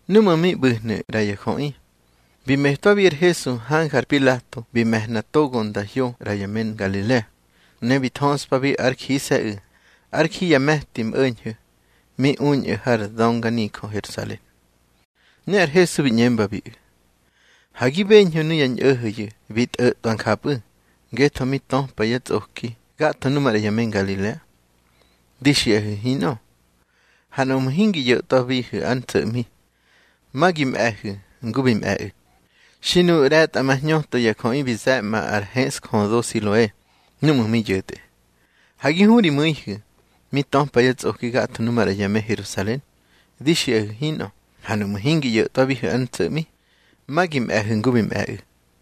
Núꞌmu̱ mi ꞌbu̱hnu̱ ꞌra ya jöꞌi bi metwabi ar Hesu hanja ar Pilato bi me̱hna togo nda hyo ꞌra ya me Ngalilea. Ne bi nthöspabi ár jise̱ꞌu̱ ár ji ya me̱ti mꞌo̱ñho̱ mi uñꞌu̱ har dönganijö Herusalen. Ne ar Hesu bi ꞌñembabiꞌu̱: —Ha gi beñhu̱ nuya ñꞌo̱ho̱yu̱ bi tꞌo̱tꞌwa njapꞌu̱ ngetho mi töpa yá tsꞌoki gatho nu maꞌra ya me Ngalilea. Di xiꞌahu̱ hinꞌö. Ha nuꞌmu̱ hingi ꞌyo̱tꞌwabihu̱ ár ntso̱ꞌmi, ma gi mꞌe̱hu̱ ngu bi mꞌe̱ꞌu̱. Xi nuꞌu̱ ꞌre̱tꞌamahñöto ya jöꞌi bi ze̱ꞌma ar heꞌsjödo Siloe núꞌmu̱ mi yo̱tꞌe, ha gi hu ri mu̱ihu̱ mi töpa yá tsꞌoki gatho nu maꞌra ya me Herusalen. Di xiꞌahu̱ hinꞌö. Ha nuꞌmu̱ hingi ꞌyo̱tꞌwabihu̱ ár ntso̱ꞌmi, ma gi mꞌe̱hu̱ ngu bi mꞌe̱ꞌu̱.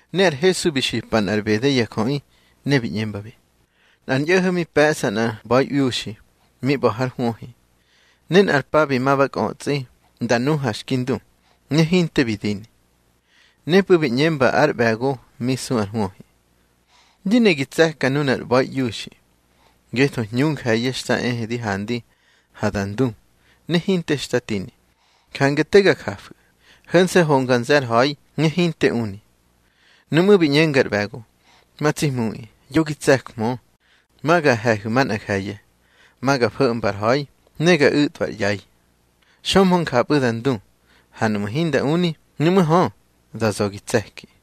Ne ar Hesu bi xipa nꞌar ꞌbede ya jöꞌi, ne bi ꞌñembabi: —Nꞌar ñꞌo̱ho̱ mi pe̱ꞌsa nꞌar ꞌba̱iꞌiuxi mi ꞌba̱ hár hwöhi. Ne nꞌar pa bi ma ba kꞌötsꞌi nda nu ha xki ndu, ne hinte bi dini. Nepꞌu̱ bi ꞌñemba ár ꞌbe̱go mi su ar hwöhi: Di ne gi tse̱ka nunar ꞌba̱iꞌiuxi, ngetho hñu nje̱ye̱ xta ehe di handi ha da ndu, ne hinte xta tini. Jange te ga jafu̱, ho̱nse̱ honga nze̱ ar ha̱i ne hinte uni. Nuꞌmú̱ bi ꞌñenga ar ꞌbe̱go: Ma tsi hmuꞌi, yo gi tse̱jmö. Ma ga he̱hu̱ manꞌa nje̱ye̱. Ma ga fo̱mba ar ha̱i ne ga u̱tꞌwa ar ꞌyai. Xömhö njapꞌu̱ da ndu. Ha nuꞌmu̱ hinda uni, nuꞌmú̱ hö, da za̱ gi tse̱ki.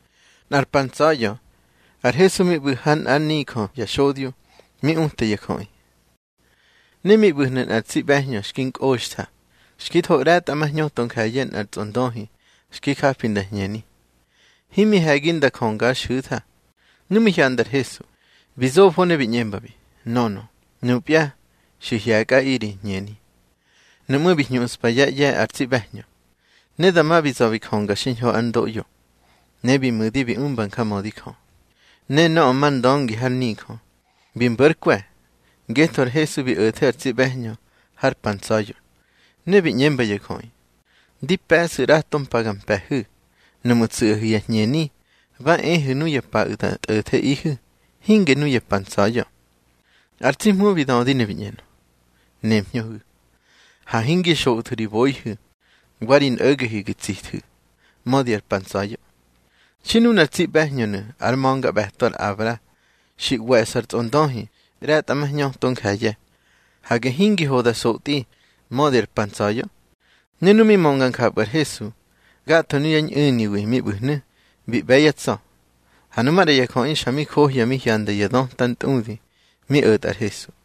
Nꞌar pa ntsa̱ya̱ ar Hesu mi ꞌbu̱ ha nꞌár nijö ya xodyo, mi uta ya jöꞌi. Ne mi ꞌbu̱hnu̱ nꞌar tsi ꞌbe̱hñö xki nkꞌoxtha. Xki tho ꞌre̱tꞌamahñöto nje̱ye̱ nꞌar tsꞌondöhi xki japi nda ñheni, himi he̱gi nda jönga ár xu̱tha. Nu mi hyanda ar Hesu, bi zofo ne bi ꞌñembabi: —Nönö, nupya xi hye̱kꞌaꞌi ri hñeni. Nuꞌmú̱ bi hñuꞌspa yá ꞌye̱ ar tsi ꞌbe̱hñö. Ne dama bi za̱ bi jönga xiñho ár ndoꞌyo, ne bi mu̱di bi umba njamödi Jö. Ne nöꞌö mar ndöngi har nijö, bi mbo̱ ár kwe̱, ngetho ar Hesu bi o̱the ar tsi ꞌbe̱hñö har pa ntsa̱ya̱. Ne bi ꞌñemba ya jöꞌi: —Di pe̱ꞌsu̱ ꞌrato mpa ga mpe̱hu̱. Nuꞌmu̱ tsu̱ꞌahu̱ ya hñeni, ba ehu̱ nuya paꞌu̱ da tꞌo̱theꞌihu̱, hinge nuya pa ntsa̱ya̱. Ar tsi Hmu bi dödi ne bi ꞌñenö: —Nemhñöhu̱. Ha hingi xoꞌthu̱ ri boihu̱ wa ri nꞌo̱gehu̱ gi tsíthu̱, mödi ar pa ntsa̱ya̱. Xi nunar tsi ꞌbe̱hñönu̱ ár ma̱ngaꞌbe̱to ar Abra, xi ꞌwe̱ꞌsa ar tsꞌondöhi ꞌre̱tꞌamahñöto nje̱ye̱, hage hingi ho da sotꞌi mödi ar pa ntsa̱ya̱. Ne nu mi mönga njapꞌu̱ ar Hesu, gatho nuyá ñꞌu̱niwi mi ꞌbu̱hnu̱, bi ꞌbe̱ yá tsa̱. Ha nu maꞌra ya jöꞌi xa mi johya mi hyanda ya döta ntꞌudi mi o̱tꞌa ar Hesu.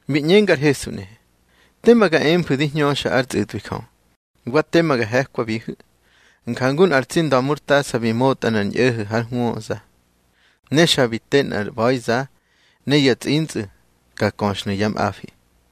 Bi ꞌñenga ar Hesu nꞌehe: —Tema ga emfu̱ di hñöxa ár tsꞌu̱tꞌwi Jö, wa tema ga he̱kwabihu̱. Njangu nꞌar tsi nda̱murtasa bi motꞌa nꞌar ñꞌo̱ho̱ hár hwöza. Ne xa bi te nꞌar ꞌba̱iza, ne ya tsꞌintsꞌu̱ ka köxhnu̱ yá mꞌafi.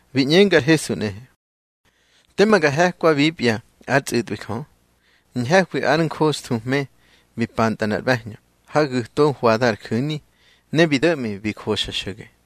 Bi ꞌñenga ar Hesu nꞌehe: —Tema ga he̱kwabipya ár tsꞌu̱tꞌwi Jö. Ñhe̱hwi ar njoxthuhme bi pantꞌa nꞌar ꞌbe̱hñö ha gu̱to hwada ar ju̱ni, ne bi do̱ꞌmi bi joxa xo̱ge.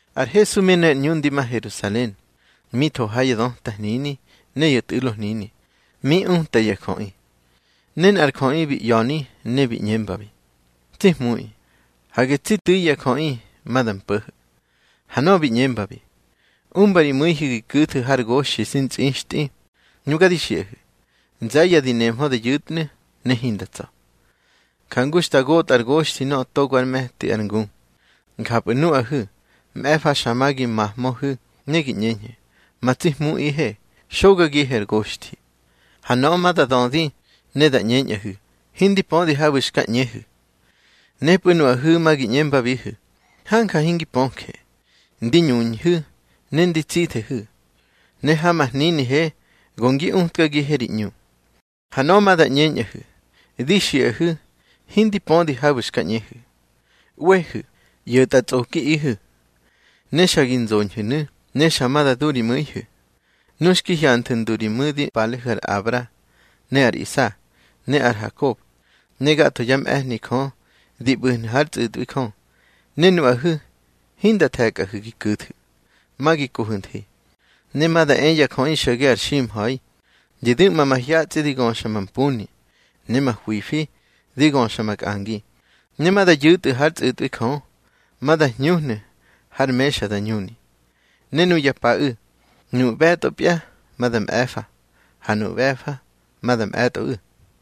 Ar Hesu mi ne ar ꞌñu ndi ma Herusalen, mi tho ha ya döta hnini ne ya tꞌu̱lo hnini, mi uta ya jöꞌi. Ne nꞌar jöꞌi bi ꞌya̱ni ne bi ꞌñembi: —Tsi Hmuꞌi, hage tsi tu̱i ya jöꞌi ma da mpo̱ho̱. Ha nöꞌö bi ꞌñembabi: —Umba ri mu̱ihu̱ gi ku̱thu̱ har goxthi xi ntsꞌixtꞌi. Nuga di xiꞌahu̱, nze̱ye̱ di nemhö da yu̱tnu̱, ne hinda tsa̱. Jangu xta gotꞌa ar goxthi nöꞌö togo ár me̱ti ar ngu, njapꞌu̱ nuꞌahu̱ mꞌe̱fa xa ma gi mahmöhu̱ ne gi ꞌñeñhu̱: Ma tsi Hmuꞌihe, xogagihe ar goxthi. Ha nöꞌö ma da dödi ne da ꞌñeñꞌahu̱: Hindi pödi habu̱ xka ꞌñehu̱. Nepꞌu̱ nuꞌahu̱ ma gi ꞌñembabihu̱: Hanja hingi pöje. Ndi ñuñhu̱ ne ndi tsithehu̱, ne ha ma hninihe go ngi utkagihe ri ꞌñu. Ha nöꞌö ma da ꞌñeñꞌahu̱: Di xiꞌahu̱ hindi pödi habu̱ xka ꞌñehu̱. ꞌWehu̱, ꞌyo̱tꞌatsꞌokiꞌihu̱. Ne xa gi nzoñhu̱nu̱, ne xa ma da du ri mu̱ihu̱, nu xki hyanthu̱ ndu ri mu̱di palehu̱ ar Abra, ne ar Isa, ne ar Hakob, ne gatho yá mꞌe̱hni Jö di ꞌbu̱hnu̱ hár tsꞌu̱tꞌwi Jö, ne nuꞌahu̱ hinda the̱kꞌahu̱ gi ku̱thu̱. Ma gi kohu̱ nthi. Ne ma da e ya jöꞌi xo̱ge ar ximha̱i, di du̱ꞌma mahyatsꞌi, di göxa mampuni, ne mahwifi di göxa makꞌangi. Ne ma da yu̱tꞌu̱ hár tsꞌu̱tꞌwi Jö, ma da hñuhnu̱ har mexa da ñuni. Ne nuya paꞌu̱, nuꞌu̱ ꞌbe̱tꞌopya, ma da mꞌe̱fa, ha nuꞌu̱ ꞌbe̱fa, ma da mꞌe̱tꞌoꞌu̱.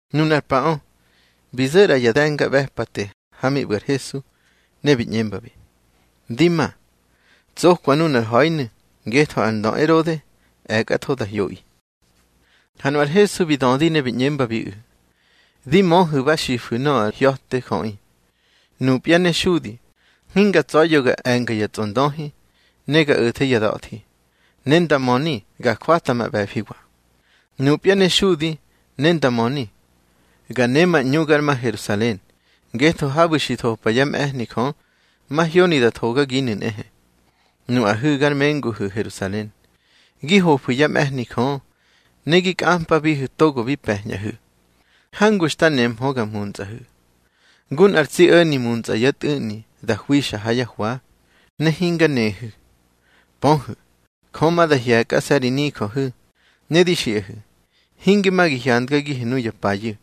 Nunar paꞌö, bi zo̱ ꞌra ya de̱ngaꞌbe̱pate ha mi ꞌbu̱ ar Hesu, ne bi ꞌñembabi: —Di ma, tsokwa nunar ha̱inu̱, ngetho ar ndö Erode e̱kꞌatho da hyoꞌi. Ha nu ar Hesu bi dödi ne bi ꞌñembabiꞌu̱: —Di möhu̱ ba xifu̱ nöꞌö ar hya̱te jöꞌi: Nupya ne xudi hinga tsa̱ya̱ ga e̱nga ya tsꞌondöhi, ne ga o̱the ya da̱thi, ne ndamöni ga jwata ma ꞌbe̱fiwa. Nupya ne xudi ne ndamöni, ga ne ma ꞌñu gar ma Herusalen, ngetho habu̱ xi thopa yá mꞌe̱hni Jö, mahyoni da thogaginu̱ nꞌehe. Nuꞌahu̱ gar menguhu̱ Herusalen, gi hofu̱ yá mꞌe̱hni Jö, ne gi kꞌampabihu̱ togo bi pe̱ñꞌahu̱. Hangu xta nehmö nga muntsꞌahu̱, ngu nꞌar tsi o̱ni muntsꞌa yá tꞌu̱ꞌni da hwixa ha yá hwa, ne hinga nehu̱. Pöhu̱, Jö ma da hye̱kꞌase̱ ri nijöhu̱. Ne di xiꞌahu̱, hinge ma gi hyandgagihu̱ nuya payu̱.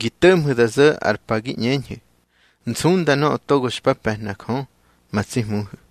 Gi to̱ꞌmhu̱ da zo̱ ar pa gi ꞌñeñhu̱: Nsunda nöꞌö togo xpa pe̱hna Jö ma tsi Hmuhu̱.